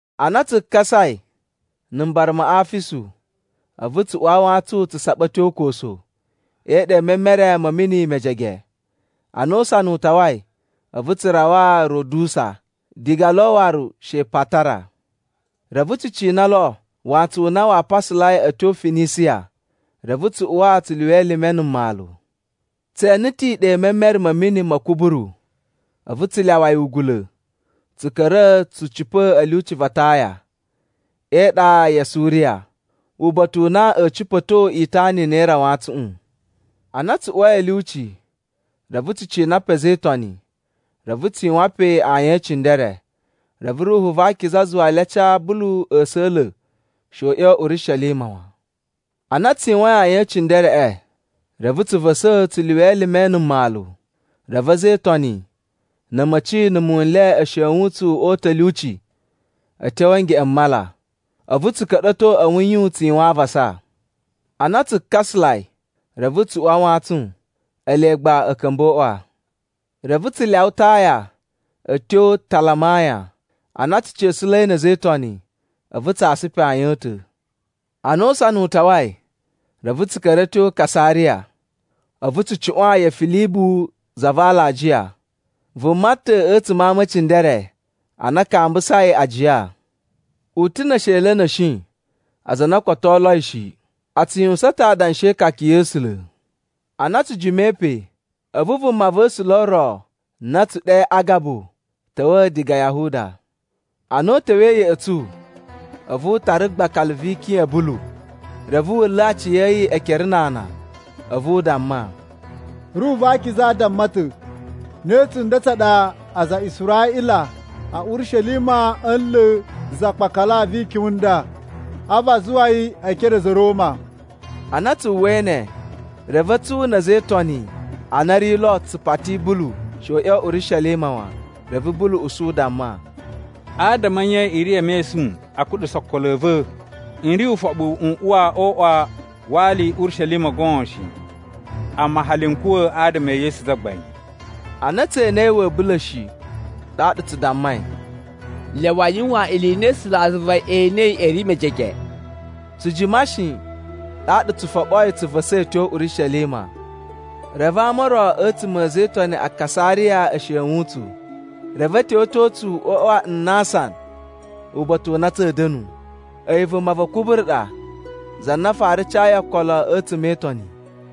Ana tsu kasai na̱ mbara ma Afisu, a̱vu tsu uwa a wantsun tsu saɓa a̱ tyo Koso e iɗa i memere ma̱ mini mejege. Ana usana u tawai, a̱vu tsu rawa Rodusa, diga lo waru she Patara. Reve tsu cina lo wantsun u na waa pasalai a̱ tyo Finisiya, reve tsu uwa tsu lyuwa elime na̱ mmalu. Tse ene ta̱ iɗa i memere ma̱ mini ma̱ Kuburu a̱vu tsu lyawa yi ugula̱ tsu ka̱ra̱ tsu cipa̱ a̱ lyuci va Taya, e iɗa ya Suriya, uba̱ta̱ u na a̱a̱ cipa̱to itana i na i ri a wantsuꞌun. Ana tsu uwai a̱ lyuci, reve tsu cina pe a̱za̱ e Itoni, reve tsu yuwan pe ayin e cindere. Reve Ruhu va Akiza zuwa le a ca Bulu a̱sa̱la̱ she u ꞌya̱wa̱ Urishelima wan. Ana tsu yuwain ayin e cindereꞌe, reve tsu va̱sa̱ tsu lyuwa elime na̱ mmalu. Reve a̱za̱ e Itoni na̱ a̱ma̱ci na̱ muwun n le e shewun tsu o uta̱ a̱ lyuci a̱ tyo a̱ ngeꞌen m mala. A̱vu tsu ka̱ɗa̱to a̱ wuyun tsu yuwan avasa. Ana tsu kasalai, reve tsu uwa a wantsun. Ele gba a̱ ka̱mba̱ o uꞌwa. Reve tsu lyawa Taya a̱ tyo Talamaya. Ana tsu ca̱sa̱la̱i na̱ a̱za̱ e Itoni, a̱vu tsa asa pe ayin a̱ ta̱. Ana usana u tawai, reve tsu ka̱ra̱ a̱ tyo Kasariya, a̱vu tsu cuꞌwan ya Filibu za va alajiya, vuma ta̱ a̱tsuma̱ a ama e cindere a na a kambusai ajiya. U ta̱ ne esheli a̱ na̱shi aza a na o koto o oloi shi, a tsu yuwusan ta̱ adanshi e ikaka ya̱ A̱sula̱. Ana tsu jimai pe, a̱vu vumava̱sula̱ ro na a̱ tsu ɗe Agabu ta̱wa̱ diga Yahuda. Ana u ta̱wa̱i ya̱ꞌa̱ tsu, a̱vu u tara gbakala vi ikyun ya̱ Bulu, reve wu nla̱ aciya̱yi ekere na ana. A̱vu u damma, “Ruhu va Akiza damma ta̱, ‘Ne tsunda tsa ɗa aza a Israꞌila a̱ Urishelima a̱a̱ nla̱ za gbakala vi ikyun i nda, a̱vu a zuwa yi e ekere a̱ a̱za̱ a̱ Roma.’” Ana tsu uwwai ne, reve a̱tsu na̱ a̱za̱ e Itoni a na a̱ ri lo tsu pati Bulu she u ꞌya̱wa̱ Urishelima wan. Reve Bulu usu u damma, “Adama a̱ nye i ri e mesun a kuɗusa okolo a̱ va̱? N ri ufoɓu n uwa o uꞌwa wa ali Urishelima goon shi, amma hali n kuwa̱ adama e Yesu Zagbain.” Ana tse enei wa̱a̱ bula̱ shi, ɗaɗa tsu dammai, “Lyawa a yuwan ili i na A̱sulazuva e enei a̱ ri mejege.” Tsu jima shi, ɗaɗa tsu foɓoi tsu va̱sa̱i a̱ tyo Urishelima. Reve ama o ro a̱tsuma̱ a̱ a̱za̱ e Itoni a Kasariya e shewun tsu, reve a̱ tyowetyo tsu o uꞌwa wa Nnasan uba̱ta̱ u na tsa̱a̱ da̱nu. A̱yi vuma va Kuburu ɗa za na fara cayi okolo a̱tsuma̱ e Itoni.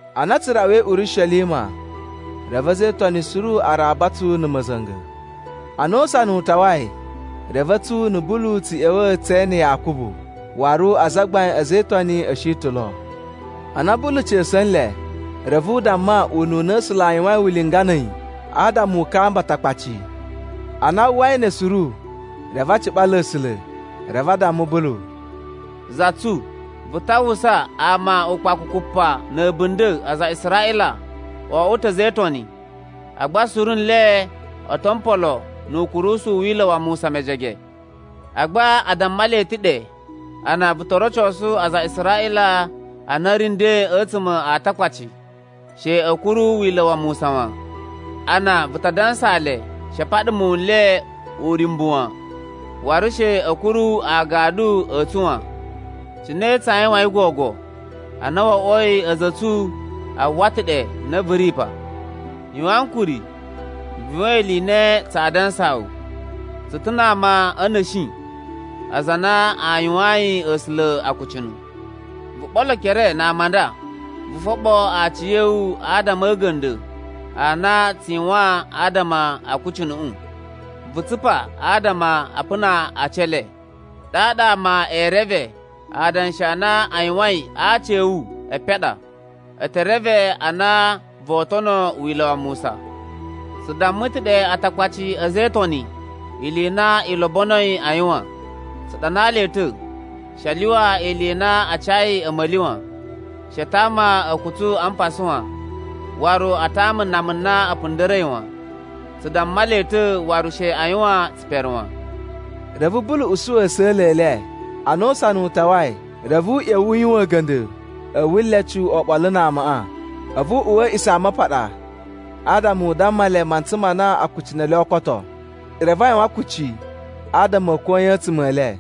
Ana tsu rawai Urishelima, reve a̱za̱ e Itoni suru a raba tsu na̱ ma̱za̱nga̱. Ana usana u tawai, reve a̱tsu na̱ Bulu tsu ꞌya̱wa̱ tse ene Yakubu, waru azagbain a̱ a̱za̱ e Itoni a̱ shi ta̱ lo. Ana Bulu ca̱sa̱ nle, reve u damma ununa A̱sula̱ a yuwain ulinga na̱ a̱yi adama u kamba Atakpaci. Ana a uwwai ne suru, reve a ciɓala A̱sula̱, reve a damma Bulu, “Za tsu, vu ta uwwusa, ama ukpakukupa na̱ a̱bunda̱ aza a Israꞌila o oꞌwo ta̱ a̱za̱ e Itoni, agba suru nle o to mpolo nu ukurusu u Wila̱ wa Musa mejege. Agba a damma le ta̱ ɗe a na vu to rocosu aza a Israꞌila a na a̱ ri nden a̱tsuma̱ a Atakpaci, she a̱ kuru Wila̱ wa Musa wan. A na vu ta dansaa le she a paɗa muwun n le uryumbu wan, waru she a̱ kuru agadu a̱ tsu wan. “Cine tsaa yuwain gogo, ana wo oꞌwoi a̱za̱ a̱ tsu a uwwa ta̱ ɗe na vu ri pa? Yuwan ankuri, vu yuwan ili i na tsaa dansaa wu. Tsu ta̱ na ama a̱ na̱shi aza a na a yuwayin A̱sula̱ akucunu. Vu ɓolo ekere na ama a nda. Vu foɓo aciya̱wu adama a̱ a̱ga̱nda̱ a na a tsu yuwan adama a akucunuꞌu. Vu tsupa adama a puna aci e le. Ɗaɗa ama ee reve adanshi a na a yuwain a aci a̱ wu epen a ɗa. E te reve a na voo tono Wila̱ wa Musa. “Tsu damma ta̱ ɗe Atakpaci a̱za̱ e Itoni ili i na i lobonoi a yuwan. Tsu ɗanaa le ta̱, she a lyuwa ili i na a cayi a̱ma̱li wan. She a tama a̱kutsu a mpasa wan, waru a tama nama na a̱ punda̱ra̱i wan. Tsu damma le ta̱ waru she a yuwan tsipere wan.” Reve Bulu usu a̱sa̱la̱ e le. Ana usana u tawai, reve u ꞌya̱wa̱ u yuwan a̱ga̱nda̱ a̱ wulecu oɓolo na amaꞌa. A̱vu u uwa a̱ A̱a̱ꞌisamapaɗa adama u damma le mantsa ma na akucunu e le oo koto, reve a yuwan kucci adama a̱ koyan a̱tsuma̱ e le.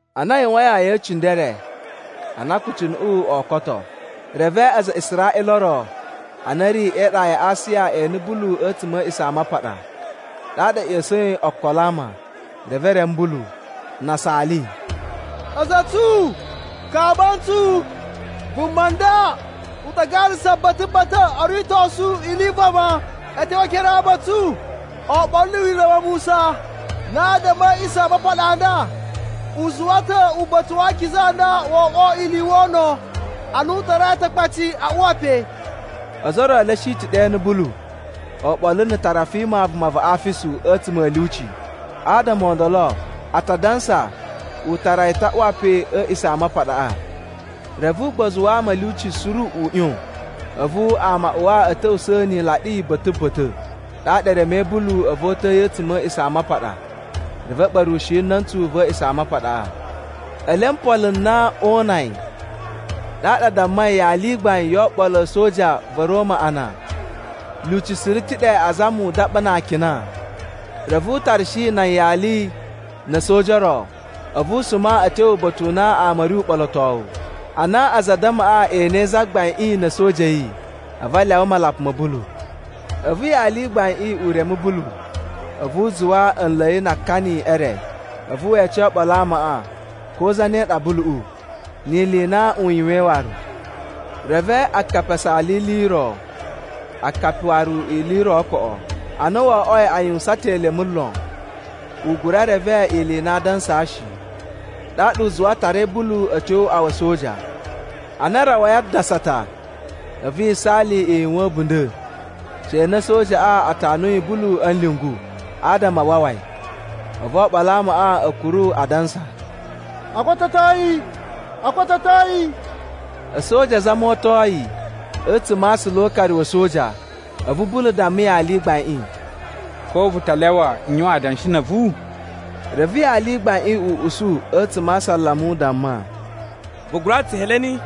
Ana a yuwain ayin e cindere a na akucunuꞌu oo koto, reve aza a Israꞌila o ro a na a̱ ri e iɗa ya Asiya e ene Bulu a̱tsuma̱ a̱ A̱a̱ꞌisamapaɗa. Ɗaɗa a̱ ꞌya̱sa̱in okolo a ama, reve e reme Bulu. Na a saali, “A̱za̱ a̱ tsu, kamba ntsu! Vuma nda u ta garasa ba̱ta̱ ba̱ta̱ o ritosu ili i vama a̱ tyo e ekere a ama a̱ tsu oɓolo na̱ Wila̱ wa Musa, na adama a̱ A̱a̱ꞌisamapaɗa a nda. U zuwa ta̱ uba̱ta̱ wa akiza u nda wo oꞌwo ili i wono a na u tarai Atakpaci a uwa pe.” Ozo o ro e le a̱ shi ta̱ ɗe e ene Bulu oɓolo na̱ Tarafima vuma va Afisu a̱tsuma̱ a̱ lyuci. Adama o ndolo, a ta dansa u tara yi ta̱ a uwa pe a̱ A̱a̱ꞌisamapaɗaꞌa. Reve ugbozu wa ama a̱ lyuci suru u ꞌyon, a̱vu ama a uwa a̱ ta̱wusa̱ ni ilaɗi ba̱ta̱ ba̱ta̱. Ɗaɗa e remei Bulu a̱vu o uta̱a̱ yi a̱tsuma̱ a̱ A̱a̱ꞌisamapaɗa reve a̱ ɓa̱rushi na̱ntsu va̱ A̱a̱ꞌisamapaɗaꞌa. Ele o mpolo n na oo una yi, ɗaɗa a dammai yali i gbain yo oɓolo a̱ a̱soja va̱ Roma a na, lyuci suru ta̱ ɗe azama u daɓa na akina. Reve u tarashi nan yali na̱ a̱soja o ro, a̱vu a suma a̱ tyo uba̱ta̱ u na ama a̱ ri uɓolotowu. Ana aza a addamaꞌa e enei zagbaiꞌin na̱ a̱soja a̱ yi a̱vu a lyawa malapa ma̱ Bulu. A̱vu yali i gbaiꞌin u reme Bulu, a̱vu u zuwa a̱ nla̱ yi na akani e re. A̱vu we ece oɓolo a amaꞌa ko zane ɗa Buluꞌu, ni ili i na u yuwain waru. Reve akapi a saala ili i ro, akapi waru ili i ro koꞌo. Ana wo oꞌwoi a yuwusan ta̱ elemu lon, u gura reve ili i na aa dansa shi, ɗaɗa u zuwa a tarai Bulu a̱ tyo o uꞌwa wa̱ a̱soja. Ana a rawai a dasata, a̱vu yisaali i yuwan a̱bunda̱ she na a̱sojaꞌa a tanuyi Bulu a̱ nlyungu adama a wawa yi. A̱vu oɓolo a amaꞌa a̱ kuru adansa, “O kototo yi, o kototo yi.” A̱soja azama o oto yi a̱tsuma̱ a aasula o ukari wa̱ a̱soja, a̱vu Bulu damma yali i gbaiꞌin, “Ko vu ta lyawa n yuwan adanshi na̱ a̱vu?” Reve yali i gbaiꞌin u usu a̱tsuma̱ a asalama u damma, “Vu gura ta̱ Tsuheleni?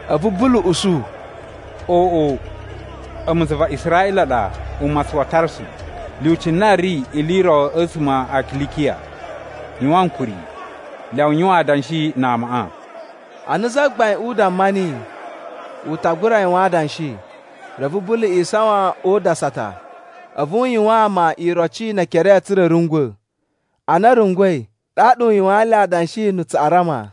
A̱vu Bulu usu, “Oꞌo, a̱mu za va Israꞌila ɗa umatsun wa Tarsu, lyuci na ri ili i ro a̱tsuma̱ a Kilikiya. Yuwan ankuri, lyawa n yuwan adanshi na amaꞌa.” Ana zagbaiꞌin u damma niyi u ta gura yuwan adanshi, reve Bulu isawan o udasata, a̱vu u yuwaan ama iroci ne ekere tsa̱ra̱ a̱ rungwa̱. Ana a̱ rungwa̱i, ɗaɗa u yuwaan nle adanshi na̱ Tsuꞌarama.